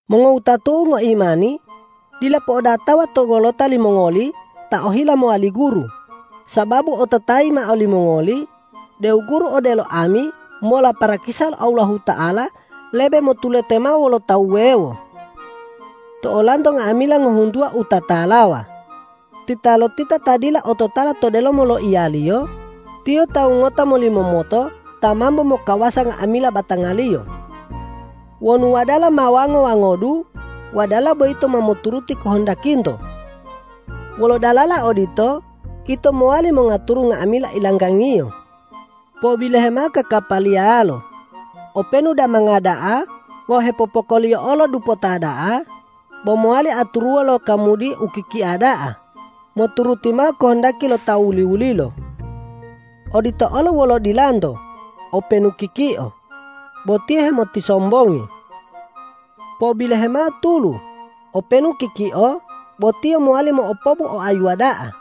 Mongowutatu'u ngoimani, dila po'odatawa to wolota limongoli ta ohila mowali guru, sababu ototayi mao limongoli deu guru odelo ami mola parakisa lo Allahuta'ala lebe motulete mao wolo ta wuwewo. To olanto nga'amila ngohuntuwa u tatalawa, titalotita ta dila ototala to delomo loiyaliyo, tiyo tawu ngota molimomoto ta mambo mokawasa nga'amila batangaliyo. Wonu wadala ma wango-wangodu, wadala boyito ma moturuti kohondakinto. Wolo dalala odito ito mowali mongaturu nga'amila ilanggangiyo. Po'obilohe mao kakapaliyalo: Openu damanga da'a wawu hepopokoliyo'o lo dupota da'a, bo mowali aturuwo lo kamudi u kikia da'a moturuti mao kohondaki lo ta wuli-wulilo. Odito olo wolo dilanto: Openu kikio, bo tiyo hemotisombongi. Po'obilohe mao tulu: Openu kikio, bo tiyo mowali mo'opobu oayuwa da'a.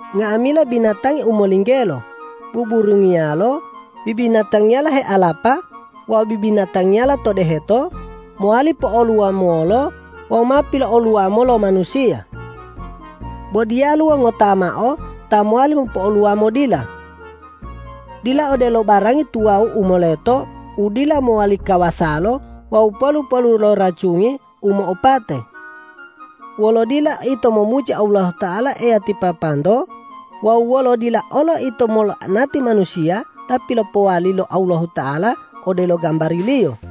Nga'amila binatangi u molinggelo, buburungiyalo, bibinatangiyala healapa wawu bibinatangiyala to deheto, mowali po'oluwamolo wawu ma pilo'oluwamo lo manusiya. Bo diyaluwo ngota mao ta mowali mopo'oluwamo dila. Dila odelo barangi tuwawu u moleto u dila mowali kawasalo wawu polu-polu lo racungi u mo'opate. Wolo dila ito momuji Allahuta'ala Eya ti Papanto wawu wolo dila olo ito mola'anati manusiya ta pilopowali lo Allahuta'ala odelo gambari-Liyo.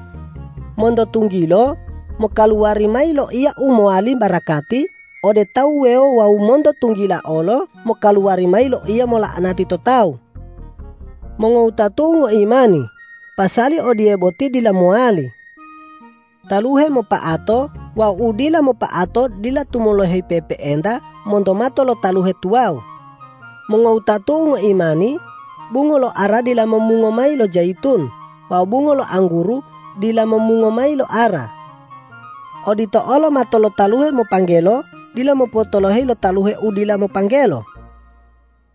Monto tunggilo mokaluwari mayi loiya u mowali barakati ode tawu wuwewo wawu monto tunggila olo mokaluwari mayi loiya mola'anati to tawu. Mongowutatu'u ngoimani, pasali odiye boti dila mowali! Taluhe mopa'ato wawu u dila mopa'ato dila tumoloheyi pe'epe'enta monto mato lo taluhe tuwawu. Mongowutatu'u ngoimani, bungo lo ara dila momungo mayi lo jayitun wawu bungo lo angguru dila momungo mayi lo ara. Odito olo mato lo taluhe mopanggelo dila mopotoloheyi lo taluhe u dila mopanggelo.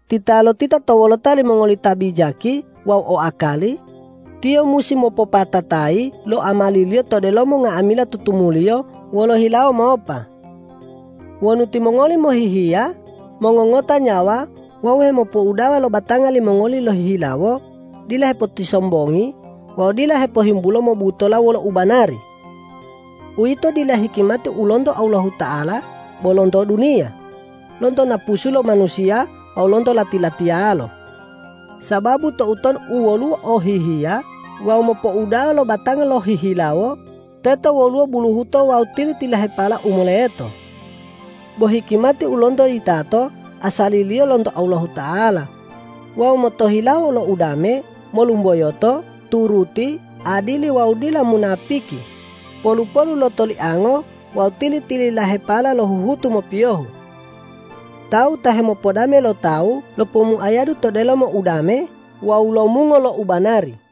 Titalotita to wolota limongoli ta bijaki wawu o akali, tiyo musi mopopatatayi lo amaliliyo to delomo nga'amila tutumuliyo wolo hilawo mopa. Wonu timongoli mohihiya, mongongota nyawa wawu hemopouda'a lo batanga limongoli lohihilawo, dila hepotisombongi wawu dila hepohimbulo mobutola wolo u banari. Uwito dila hikimati u lonto Allahuta'ala bo lonto duniya, lonto napusu lo manusiya wawu lonto lati-latiyalo. Sababu toutonu u woluwo o hihiya wawu mopouda'a lo batanga lohihilawo, teto woluwo buluhuto wawu tili-tililahepala u moleto. Bo hikimati u lonto yitato asaliliyo lonto Allahuta'ala wawu motohilawo lo udame, molumboyoto, turuti, adili wawu dila munapiki, polu-polu lo toliango wawu tili-tililahepala lo huhutu mopiyohu. Tawu ta hemopodame lo tawu lopomuayadu to delomo udame wawu lomungo lo u banari.